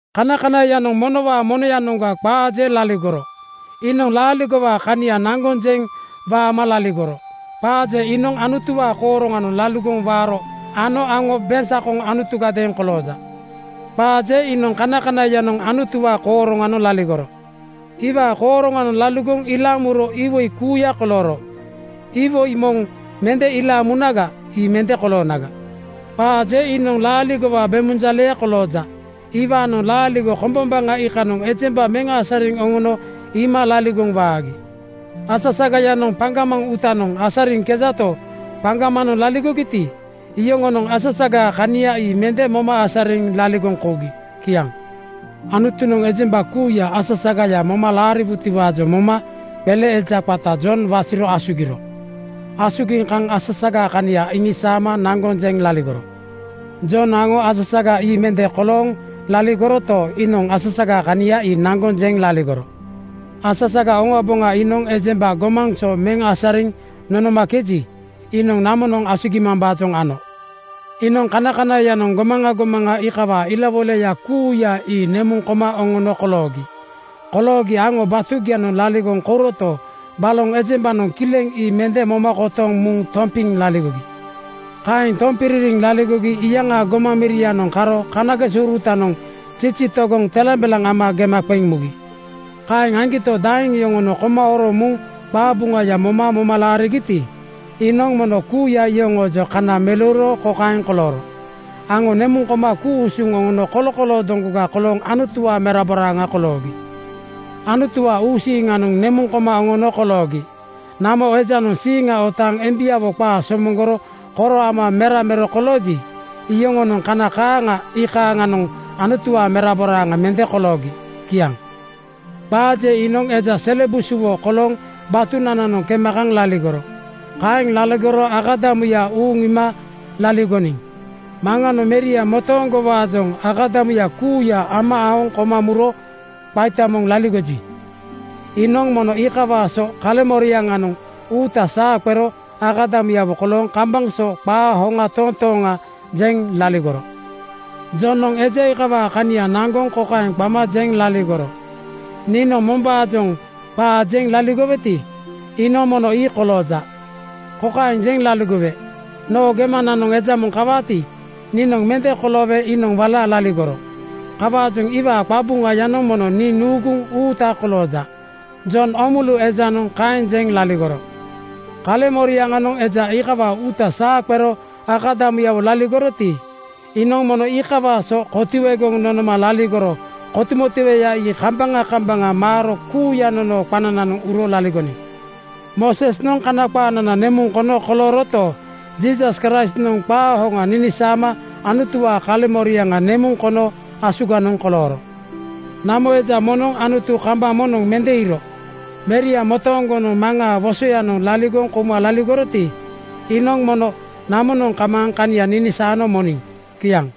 Kanakanaiyanoŋ monowaa monoyanoŋga qaa je laligoro. Iinoŋ laaligowaa kania naŋgoŋ jeŋ waama laligoro. Qaa je iinoŋ Anutuwaa kooroŋanoŋ laligoŋ waaro ano aŋo beŋsakoŋ Anutugadeeŋ kolooja. Qaa je iinoŋ kanakanaiyanoŋ Anutuwaa kooroŋanoŋ laligoro. Iwaa kooroŋanoŋ laligoŋ ilaaŋ muro iwoi kuuya kolooro. Iwoi moŋ mende ilaaŋ munaga, ii mende koloonaga. Qaa je iinoŋ laaligowaa bemunjaleya kolooja. Iwaanoŋ laaligo kombombaŋa iikanoŋ ejemba meŋ asariŋ oŋono iima laligoŋ waagi. Asasagayanoŋ paŋgamaŋ uutanoŋ asariŋkejato, paŋgamanoŋ laligogiti, iyoŋonoŋ asasagaa kania ii mende moma asariŋ laligoŋ kougi. Kiaŋ. Anutunoŋ ejemba kuuya asasagaya moma laariwutiwaajoŋ moma qele eja qata Jon wasiro asugiro. Asugiŋ kaŋ asasagaa kania iŋisaama naŋgoŋ jeŋ laligoro. Jon aŋo asasaga ii mende kolooŋ laligoroto, iinoŋ asasagaa kania ii naŋgoŋ jeŋ laligoro. Asasaga oŋaboŋa iinoŋ ejemba gomaŋ so meŋ asariŋ nonomakeji, iinoŋ namonoŋ asugimambaajoŋ ano. Iinoŋ kanakanaiyanoŋ gomaŋa gomaŋa iikawaa ilawoilaya kuuya ii nemuŋ koma oŋono koloogi. Koloogi aŋo batugianoŋ laligoŋ kouroto, baloŋ ejembanoŋ kileŋ ii mende moma kotoŋ muŋ tompiŋ laligogi. Kaeŋ tompiririŋ laligogi iyaŋaa gomaŋ mirianoŋ karo kanagesourutanoŋ zizi togoŋ telambelaŋ ama gema qeŋ mugi. Kaeŋ aŋgito, daeŋ yoŋonoŋ koma horoŋ muŋ qabuŋaya moma moma laarigiti, iinoŋ mono kuuya iyoŋoojoŋ kana meleuro kokaeŋ kolooro: Aŋo nemuŋ koma ku-usuŋ oŋono kolokoloo doŋgoga kolooŋ Anutuwaa meraboraaŋa koloogi. Anutuwaa uusiiŋanoŋ nemuŋ koma oŋono koloogi. Namo ejanoŋ siiŋa otaaŋ embiawo qaa somoŋgoro koro ama mera mero kolooji, iyoŋonoŋ kana kaaŋa iikanoŋ Anutuwaa meraboraaŋa mende koloogi. Kiaŋ. Qaa je iinoŋ eja sele busuwo kolooŋ batunananoŋ kema kaŋ laligoro. Kaeŋ laligoro akadamuya uuŋ iima laligoniŋ. Maŋanoŋ Meria motooŋgowaajoŋ akadamuya kuuya ama aoŋ koma muro qaita moŋ laligoji, iinoŋ mono iikawaa so kaleŋmoriaŋanoŋ uuta saa qero akadamuyawo kolooŋ kambaŋ so qaa hoŋ toontooŋa jeŋ laligoro. Jonoŋ eja iikawaa kania naŋgoŋ kokaeŋ qama jeŋ laligoro, “Niinoŋ mombaajoŋ qaa jeŋ laligoweti, iinoŋ mono ii kolooja. Kokaeŋ jeŋ laligowe: Noo gemananoŋ eja moŋ kawaati, niinoŋ mende koloowe iinoŋ wala laligoro. Kawaajoŋ iwaa qabuŋayanoŋ mono nii nuuguŋ uuta kolooja.” Jon Oomulu ejanoŋ kaeŋ jeŋ laligoro. Kaleŋmoriaŋanoŋ eja iikawaa uuta saa qero akadamuyawo laligoroti, iinoŋ mono iikawaa so kotuegoŋ nonoma laligoro. Kotumotueya ii kambaŋa kambaŋa maaro kuuya nonoo qanananoŋ uro laligoniŋ. Moosesnoŋ Kana qaanana nemuŋ kono kolooroto, Jiisas Kraistnoŋ qaa hoŋa ninisaama Anutuwaa kaleŋmoriaŋa nemuŋ kono asuganoŋ kolooro. Namo eja moŋnoŋ Anutu kambaŋ moŋnoŋ mende iiro. Meria motooŋgonoŋ Maŋaa wosoyanoŋ laligoŋ kouma laligoroti, iinoŋ mono namonoŋ kamaaŋ kania ninisaano moniŋ. Kiaŋ.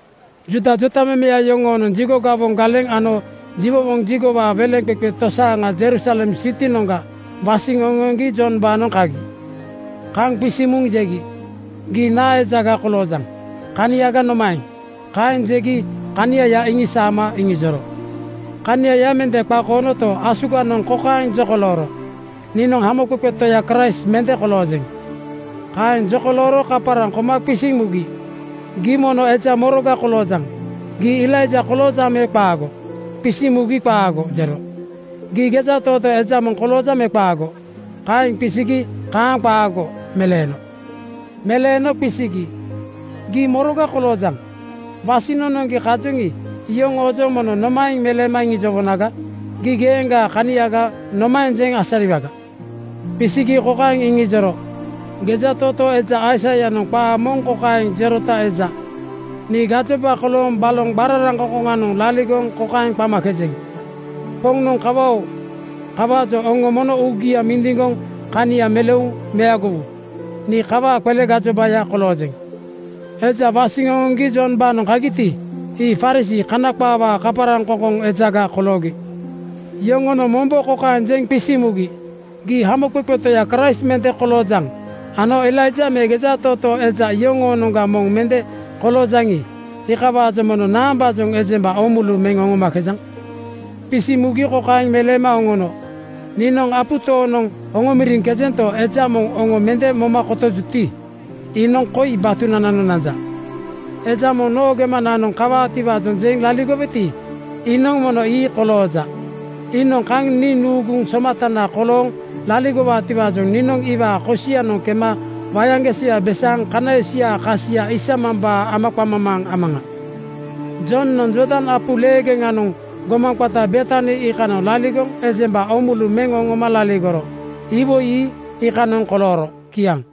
Juuda jotamemeya yoŋonoŋ jigo gawoŋ galeŋ ano jiwowoŋ jigowaa weleŋqeqe tosaaŋa Jerusalem sitinoŋga wasiŋ oŋoŋgi Jombaanoŋ kagi. Kaŋ qisiŋ muŋ jegi, “Gii naa ejaga koloojaŋ? Kaniaga nomaeŋ?” Kaeŋ jegi kaniaya iŋisaama iŋijoro. Kaniaya mende qakoonoto, asuganoŋ kokaeŋ jokolooro, “Niinoŋ Hamoqeqe Toya Kraist mende koloojeŋ.” Kaeŋ jokolooro kaparaŋ koma qisiŋ mugi, “Gii mono eja moroga koloojaŋ? Gii Elaija koloojaŋ me qaago?” Qisiŋ mugi “Qaago!” jero. “Gii gejatootoo eja moŋ koloojaŋ me qaago?” Kaeŋ qisigi “Kaaŋ qaago!” meleeno. Meleeno qisigi, “Gii moroga koloojaŋ? Wasiŋ nonoŋgi kajoŋi, iyoŋoojoŋ mono nomaeŋ meleema iŋijowonaga? Gii geeŋgaa kaniaga nomaeŋ jeŋ asariwaga?” Qisigi kokaeŋ iŋijoro, “Gejatootoo eja Aisaianoŋ qaa moŋ kokaeŋ jerota eja, ‘Nii gajoba kolooŋ baloŋ qararaŋkoŋkoŋanoŋ laligoŋ kokaeŋ qamakejeŋ: Poŋnoŋ kawa-oo! Kawaajoŋ oŋo mono uugia mindiŋgoŋ kania meleuŋ meagowu.’ Nii kawaa qele gajobaya koloojeŋ.” Eja wasiŋ oŋoŋgi Jombaanoŋ kagiti, ii Farisii (Kana qaawaa kaparaŋkoŋkoŋ) ejaga koloogi. Yoŋonoŋ mombo kokaeŋ jeŋ qisiŋ mugi, “Gii Hamoqeqe Toya Kraist mende koloojaŋ ano Elaija me gejatootoo eja yoŋoonoŋga moŋ mende koloojaŋi, iikawaajoŋ mono naambaajoŋ ejemba oomulu meŋ oŋomakejaŋ?” Qisiŋ mugi kokaeŋ meleema oŋono, “Niinoŋ apu tooŋnoŋ oŋomoriŋkejento, eja moŋ oŋo mende moma kotojuti, iinoŋ koi batugianoŋ nanja. Eja moŋ noo gemananoŋ kawaatiwaajoŋ jeŋ laligoweti, iinoŋ mono ii kolooja. Iinoŋ kaŋ nii nuuguŋ somatana kolooŋ laligowaatiwaajoŋ niinoŋ iwaa kosianoŋ kema wayaŋgesoya besaaŋ kana esuyaa kasia isamambaa amaqamamaa amaŋa.” Jonoŋ Jordan apu leegeŋanoŋ gomaŋ qata Betani iikanoŋ laligoŋ ejemba oomulu meŋ oŋoma laligoro. Iwoi ii iikanoŋ kolooro. Kiaŋ.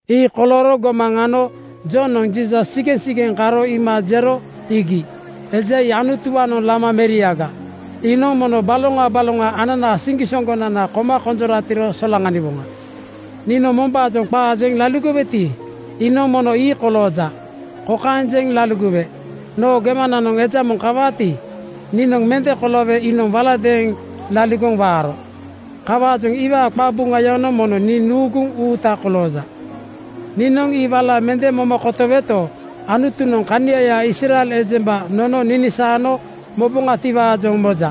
Ii kolooro gomaŋ ano Jonoŋ Jiisas sigeŋsigeŋ karo iima jero, “Iigi, eja ii Anutuwaanoŋ lama meriaga. Iinoŋ mono baloŋa baloŋa ananaa siŋgisoŋgonana koma konjoratiro solaŋaniwoŋa. Niinoŋ mombaajoŋ qaa jeŋ laligoweti, iinoŋ mono ii kolooja. Kokaeŋ jeŋ laligowe: Noo gemananoŋ eja moŋ kawaati, niinoŋ mende koloowe iinoŋ walagadeeŋ laligoŋ waaro. Kawaajoŋ iwaa qabuŋayanoŋ mono nii nuuguŋ uuta kolooja. Niinoŋ ii wala mende moma kotoweto, Anutunoŋ kaniaya Israel ejemba nono ninisaano moboŋatiwaajoŋ moja.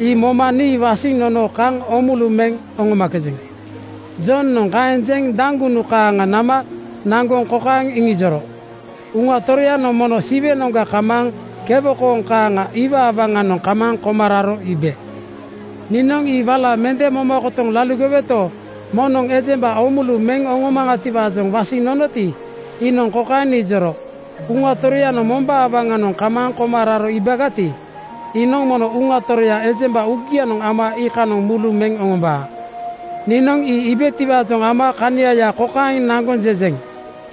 Ii moma nii wasiŋ nono kaŋ oomulu meŋ oŋomakejeŋ.” Jonoŋ kaeŋ jeŋ daŋgunu kaaŋa nama naŋgoŋ kokaeŋ iŋijoro, “Uŋa Toroyanoŋ mono Siwenoŋga kamaaŋ kewo kooŋ kaaŋa iwaa waŋanoŋ kamaaŋ koma raro iibe. Niinoŋ ii wala mende moma kotoŋ laligoweto, moŋnoŋ ejemba oomulu meŋ oŋomaŋatiwaajoŋ wasiŋ nonoti, iinoŋ kokaeŋ nijoro, ‘Uŋa Toroyanoŋ mombaa waŋanoŋ kamaaŋ koma raro iibagati, iinoŋ mono Uŋa Toroya ejemba uugianoŋ ama iikanoŋ mulu meŋ oŋombaa.’ Niinoŋ ii iibetiwaajoŋ ama kaniaya kokaeŋ naŋgoŋ jejeŋ,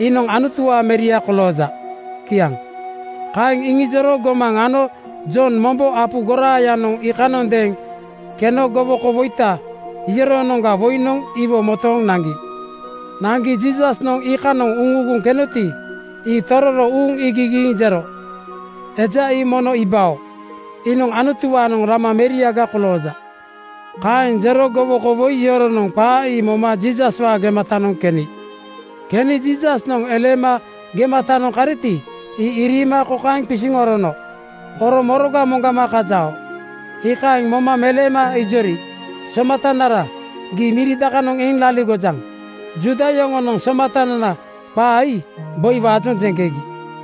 ‘Iinoŋ Anutuwaa Meria kolooja.’” Kiaŋ. Kaeŋ iŋijoro gomaŋ ano Jonoŋ mombo apu goraayanoŋ iikanondeeŋ keno gowokouruta yoŋoonoŋga woinoŋ iwo motooŋ naŋgi. Naŋgi Jiisasnoŋ iikanoŋ uŋuuguŋ kenoti, ii tororo uuŋ iigigiiŋ jero, “Eja ii mono iibao. Iinoŋ Anutuwaanoŋ lama meriaga kolooja.” Kaeŋ jero gowoko woi yoronoŋ qaa ii moma Jiisaswaa gematanoŋ keni. Keni Jiisasnoŋ eleema gematanoŋ kariti, ii iriima kokaeŋ qisiŋ orono, “Oro moroga moŋgama kajao?” Iikaeŋ moma meleema ijori, “Somatanara, gii miri dakanoŋ eŋ laligojaŋ?” (Juuda yoŋonoŋ ‘Somatanana’ qaa ii boiwaajoŋ jeŋkegi.)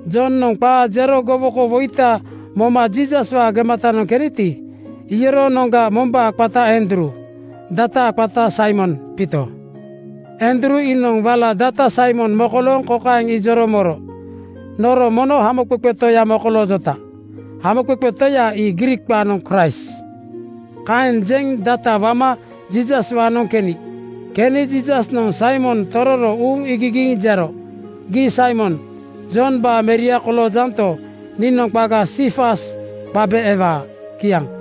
Jonoŋ qaa jero gowoko woita moma Jiisaswaa gematanoŋ keniti, iyoroonoŋga mombaa qata Andruu, dataa qata Saimon Piito. Andruu iinoŋ wala data Saimon mokolooŋ kokaeŋ ijoro moro, “Noro mono Hamoqeqe Toya mokoloojota.” Hamoqeqe Toya ii Griik qaanoŋ Kraist. Kaeŋ jeŋ data wama Jiisaswaanoŋ keni. Keni Jiisasnoŋ Saimon tororo uuŋ iigigiiŋ jero, “Gii Saimon, Jombaa meria koloojanto, niinoŋ qaga Siifas qabe ewaa.” Kiaŋ.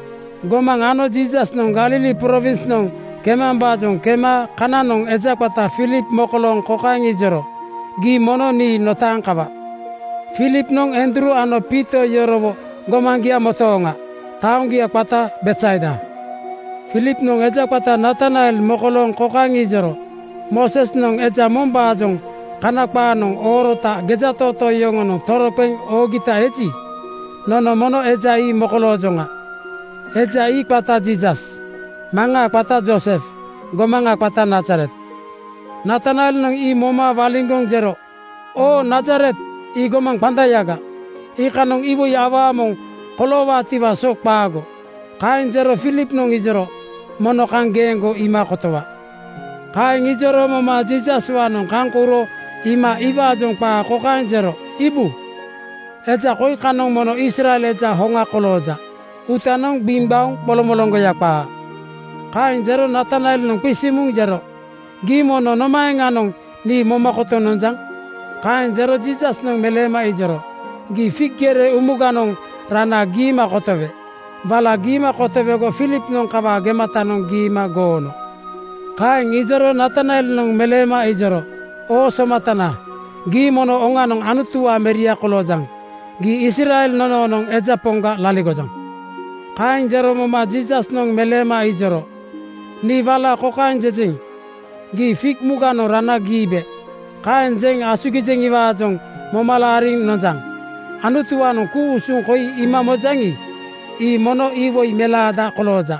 Gomaŋ ano Jiisasnoŋ Galili prowinsnoŋ kemambaajoŋ kema kananoŋ eja qata Filip mokolooŋ kokaeŋ ijoro, “Gii mono nii notaaŋ kawa!” Filipnoŋ Andruu ano Piito yorowo gomaŋgia motooŋa. Taoŋgia qata Betsaida. Filipnoŋ eja qata Natanael mokolooŋ kokaeŋ ijoro, “Moosesnoŋ eja mombaajoŋ Kana qaanoŋ oorota gejatootoo yoŋonoŋ toroqeŋ oogita eji, nono mono eja ii mokoloojoŋa. Eja ii qata Jiisas, maŋaa qata Joosef, gomaŋa qata Nazaret.” Natanaelnoŋ ii moma waliŋgoŋ jero, “Oo Nazaret! Ii gomaŋ qandayaga. Iikanoŋa iwoi awaa moŋ koloowaatiwaa so qaago.” Kaeŋ jero Filipnoŋ ijoro, “Mono kaŋ geeŋgo iima kotowa!” Kaeŋ ijoro moma Jiisaswaanoŋ kaŋ kouro iima iwaajoŋ qaa kokaeŋ jero, “Iibu! Eja koi kanoŋ mono Israel eja hoŋa kolooja. Uutanoŋ gbiŋgbaoŋ qolomoloŋgoya qaa.” Kaeŋ jero Natanaelnoŋ qisiŋ muŋ jero, “Gii mono nomaeŋanoŋ nii moma kotoŋ nonjaŋ?” Kaeŋ jero Jiisasnoŋ meleema ijoro, “Gii fig gere umuganoŋ rana giima kotowe. Wala giima kotowego Filipnoŋ kawaa gematanoŋ giima goono.” Kaeŋ ijoro Natanaelnoŋ meleema ijoro, “Oo Somatana, gii mono oŋanoŋ Anutuwaa Meria koloojaŋ. Gii Israel nonoonoŋ eja Poŋga laligojaŋ.” Kaeŋ jero moma Jiisasnoŋ meleema ijoro, “Nii wala kokaeŋ jejeŋ, ‘Gii fig umuganoŋ rana giibe.’ Kaeŋ jeŋ asugijeŋiwaajoŋ moma laariŋ nonjaŋ. Anutuwaanoŋ ku-usuŋ koi iima mojaŋi, ii mono iwoi melaada kolooja.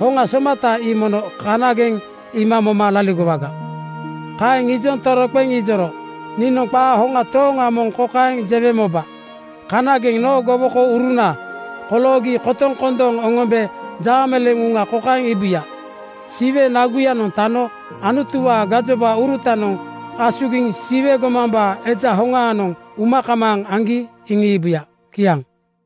Hoŋa somata ii mono kanageŋ iima moma laligowaga.” Kaeŋ ijoŋ toroqeŋ ijoro, “Niinoŋ qaa hoŋ tooŋa moŋ kokaeŋ jewe moba: Kanageŋ noo gowokouruna koloogi kotoŋ kondooŋ oŋombe jaameleeŋ uŋa kokaeŋ iibuya: Siwe nagunoŋ tano Anutuwaa gajobaurutanoŋ asugiŋ Siwe gomambaa Eja Hoŋaanoŋ uma kamaaŋ aŋgi iŋiibuya.” Kiaŋ.